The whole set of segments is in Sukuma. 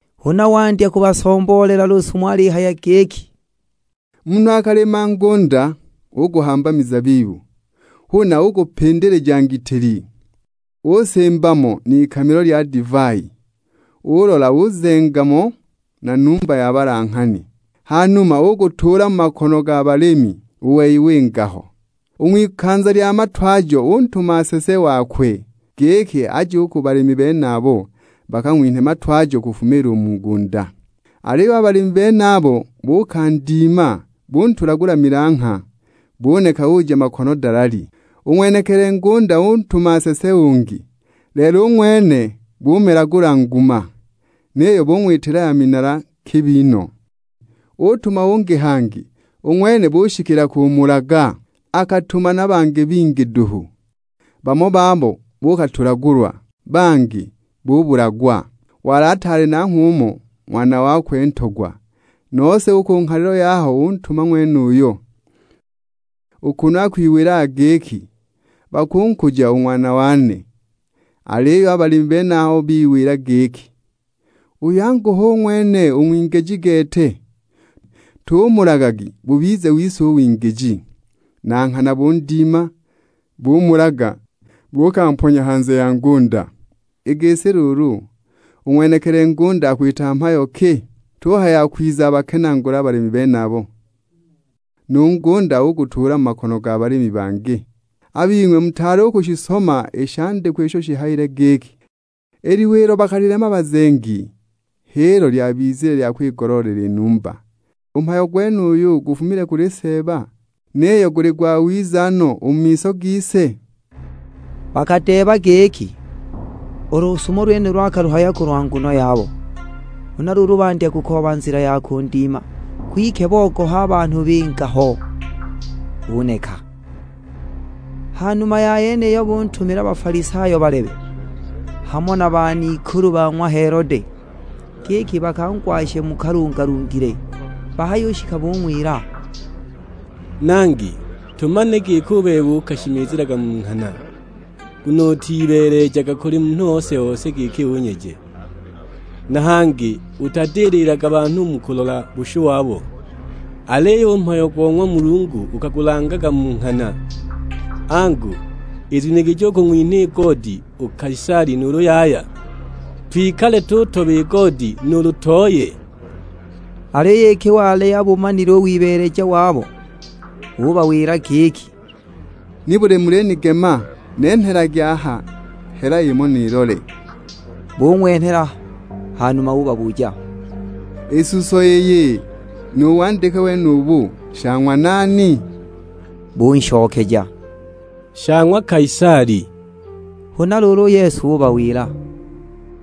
Huna wandya kubasomboolela lusumo alihaya giki, "Munhu akalima ngunda, uguhamba mizabibu, huna ugupindilija ngitili, usimba mo n'ikamilo lya divai. Ulola uzenga mo na numba ya balanghani, ha numa ugutuula mu makono ga balimi, u wei winga ho. U ng'wikanza lya matwajo utuma nsese wakwe, giki aje u ku balimi benabo, bakang'winhe matwajo kufuma u mu ngunda. Aliyo a balimi benabo buukandima buntulagula milangha, buneka uja makono dalali. U ng'wenekili ngunda utuma nsese ungi, lelo u ng'wene bumelagula nguma, niyo bung'witila ya minala kibi no! Utuma ungi hangi, u ng'wene bushikila kumulaga! Akatuma na bangi bingi duhu; bamo babo buukatulagulwa, bangi bubulagwa! Wali ataali nanghwe umo; ng'wana wakwe ntogwa, nose u ku nghalilo yaho untuma ng'wenuyo, u kunu akwiwilaga giki, 'Bakunkuja u ng'wana wane!' Aliyo a balimi benabo biwila giki, 'Uyu angu hu ng'wene u ng'wingiji gete, tumulagagi bubize wise u wingiji!' Na nghana bundima, bumulaga, buukamponya hanze ya ngunda!" "I gisi luulu, u ng'wenekili ngunda akwita mhayo ki? Tuhaya akwiza abakenaagule a balimi benabo, nu ngunda ugutuula mu makono ga balimi bangi! A bing'we mutaali u kushisoma i shandikwa isho shihayile giki, 'I liwe ilo bakalilema bazengi h'ilo lyabizile lya kwigoloolela i numba U mhayo gwenuyu gufumile kuli Seeba, niyo guli gwawiza no u mu miso gise?' " Bakadeeba giki, u lusumo lwenulo akaluhaya kulwa nguno yabo, huna luulu bandya kukooba nzila ya kundima, kwike bubogoha a banhu binga ho, buneka. Ha numa ya yeniyo, buntumila Bafalisayo balebe, hamo na ban'ikulu ba ng'wa Helode, giki bakangwashe mu kalungalungile. Bahayushika bung'wila, "Nangi, tumanile giki u bebe ukashimizilaga mu nghana, nguno utibeelejaga kuli munhu ose-ose giki unyeje; na hangi utadililaga banhu mu kulola bushu wabo, aliyo u mhayo go ng'wa Mulungu ukagulangaga mu nghana. Angu, izuniligije u kung'winha goodi u Kaisali nuulu yaya? Twikale tutoba i goodi nuulu tooye?" Aliyo iki wali abumanile u wibeeleja wabo, ubawila giki, "Nibuli mulinigema? Nenhelagi aha hela imo nilole." Bung'wenhela; hanuma ubabuja, "I suso iyi nu wandike wenubu, sha ng'wa nani?" Bunshokeja, "Sha ng'wa Kaisali." Huna luulu u Yesu ubawila,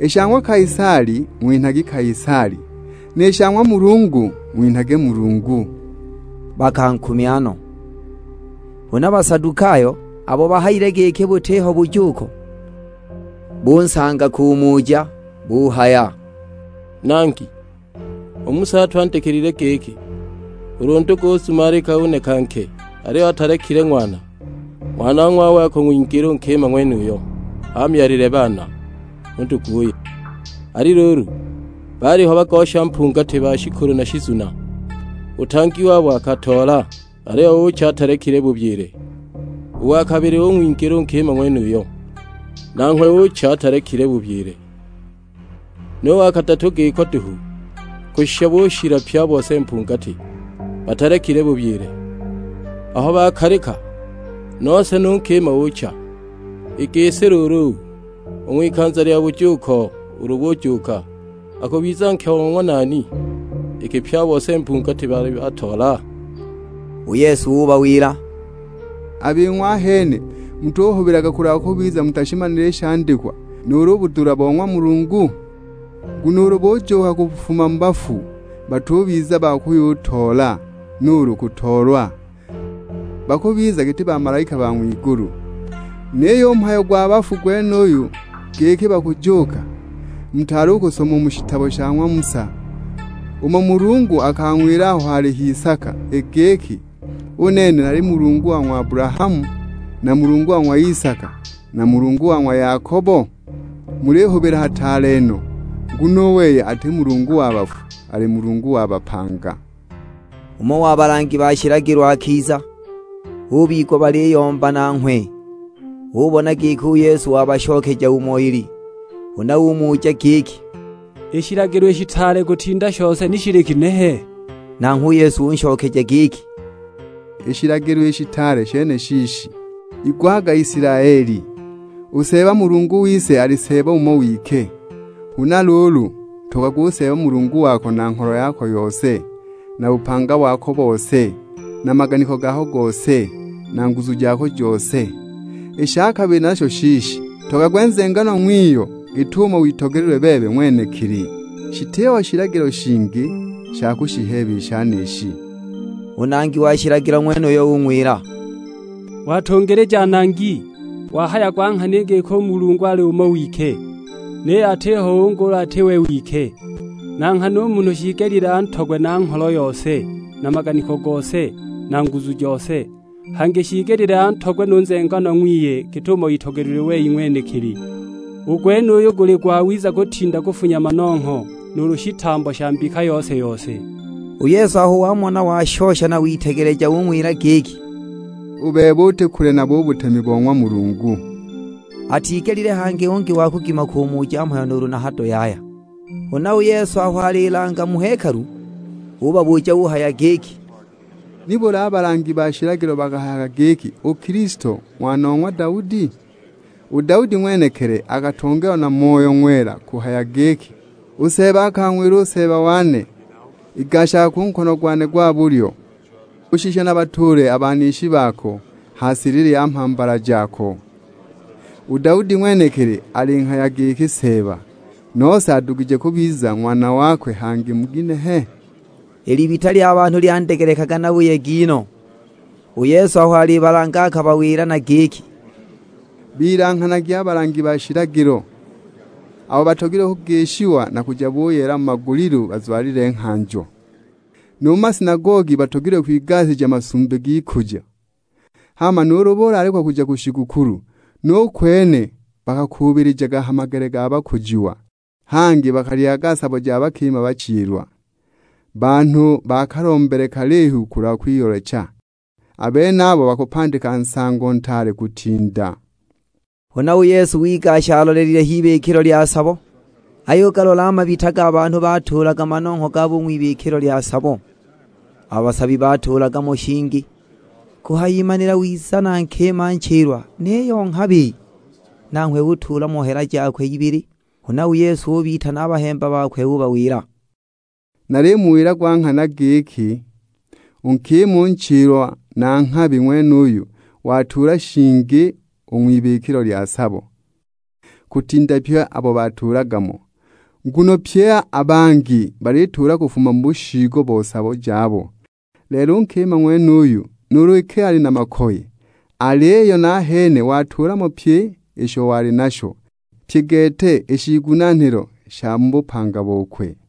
"I sha ng'wa Kaisali ng'winhagi Kaisali, ni sha ng'wa Mulungu ng'winhagi Mulungu." Bakankumya no! Huna Basadukayo, abo bahayile giki butiho bujuuko, bunsanga kumuja; buhaya, "Nangi, u Musa atwandikilile giki, ulu ndugu uzumalika uneka nke aliyo atalekile ng'wana, ng'wanong'wawe akung'wingila u nkima ng'wenuyo, amyalile baana u nduguye. Ali luulu, baaliho bagosha mpungati ba shikulu na shizuna. U tang@i wabo akatoola, aliyo ucha atalekile bubyile. U wa kabili ung'wingila u nkima ng'wenuyo, nanghwe ucha atalekile bubyile, nu wa kadatu giko duhu. Kushisha bushila pye a bose mpungati; batalekile bubyile. Aho bakalika, nose nu nkima ucha! I gisi luulu, u ng'wikanza lya bujuuko, ulu bujuuka, akubiza nke o ng'wa nani, iki pye a bose mpungati baali bantoola?" U Yesu ubawila, "A bing'we ahene mutuhubilaga kulwa kubiza mutashimanile i shandikwa nu budula bo ng'wa Mulungu? Nguno ulu bujuuka kufuma mu bafu batubiza ba kuyutoola nuulu kutoolwa, bakubiza giti bamalaika ba ng'wigulu. Niyo u mhayo gwa bafu gwenuyu giki bakujuuka, mutaali u kusoma u mu shitabo sha ng'wa Musa, umo Mulungu akang'wilila aho wali h'isaka; i giki, 'U nene nali Mulungu wa ng'wa Abulahamu, na Mulungu wa ng'wa Isaka, na Mulungu wa ng'wa Yakobo?' Mulihubila hataale no, nguno u wei ati Mulungu wa bafu, ali Mulungu wa bapanga." Umo wa balangi ba shilagilo akiza, ubigwa baliyomba nanghwe, ubona giki u Yesu wabashokeja umo ili. Huna umuja giki, "I shilagilo i shitaale kutinda shose ni shili kinehe?" Nanghwe u Yesu unshokeja giki, "I shilagilo i shitaale shene shiishi, 'Igwaga Isilaeli, u Seeba Mulungu wise ali Seeba umo wike, huna luulu, ntogagwe u Seeba Mulungu wako na ngholo yako yose, na bupanga wako bose, na maganiko gako gose, na nguzu jako jose.' I sha kabili nasho shiishi, 'Ntogagwe nzenganwa ng'wiyo git'umo witogelilwe bebe ng'wenekili.' Shitiho shilagilo shingi sha kushiheeba i shenishi." U nangi wa shilagilo ng'wenuyo, ung'wila, "Watungilija Nangi, wahaya gwa nghana i giki u Mulungu ali umo wike, niyo atiho ungi ulu ati we wike. Na nghana u munhu shiigelile antogwe na ngholo yose, na maganiko gose, na nguzu jose, hangi shiigelile antogwe nu nzenganwa ng'wiye git'umo itogelilwe wei ng'wenekili. U gwenuyu guli gwawiza kutinda kufunya manongho nuulu shitambo sha mbika yose-yose." U Yesu aho wamona washosha na witegeleja ung'wila giki, "U bebe uti kule nabo u butemi bo ng'wa Mulungu." Atigelile hangi ungi wa kugima kumuja mhayo nuulu na hado yaya. Huna u Yesu aho alilanga mu hekalu, ubabuja uhaya giki, "Nibuli a balangi ba shilagilo bakahayaga giki u Kilisto ng'wana o ng'wa Daudi? U Daudi ng'wenekili akatongeelwa na Moyo Ng'wela kuhaya giki, 'U Seeba akang'wila u Seeba wane, Igashaga ku nkono gwane gwa bulyo kushisha nabatuule a banishi bako ha silili ya mhambala jako.' U Daudi ng'wenekili alinghaya giki Seeba, nose adugije kubiza ng'wana wakwe hangi mu ginehe?" I libita lya banhu lyandegelekaga na buyegi no. U Yesu aho alibalanga akabawila na giki, "Bilanghanagi a balangi ba shilagilo, abo batogilwe kugishiwa na kuja buyeela mu magulilu bazwalile nghanjo. Nu mu masinagogi batogilwe kwigasija masumbi g'ikujo, hama nuulu bulaalikwa kuja ku shigukulu, nu kwene bakakuubilijaga ha magele ga bakujiwa. Hangi bakalyaga sabo ja bakima bachilwa, banhu ba kalombele kalihu kulwa kwiyoolecha. A benabo bakupandika nsango ntaale kutinda!" Huna u Yesu wigasha alolelile h'ibikilo lya sabo, ayugalola a mabita ga banhu batuulaga manongho gabo u ng'wibikilo lya sabo, a basabi batuulaga mo shingi. Kuhayimanila wiza na nkima nchilwa, niyo nghabi; nanghwe utuula mo hela jakwe ibili. Huna u Yesu ubitana a bahemba bakwe ubawila, "Nalimuwila gwa nghana giki, u nkima u nchilwa na nghabi ng'wenuyu watuula shingi u ng'wibikilo lya sabo, kutinda pye abo batuulaga mo. Nguno pye a bangi balituula kufuma mu bushiigo bo sabo jabo, lelo u nkima ng'wenuyu nuulu iki ali na makoye, aliyo nahene watuula mo pyi isho wali nasho; pye gete i shiigunaanilo sha mu bupanga bokwe."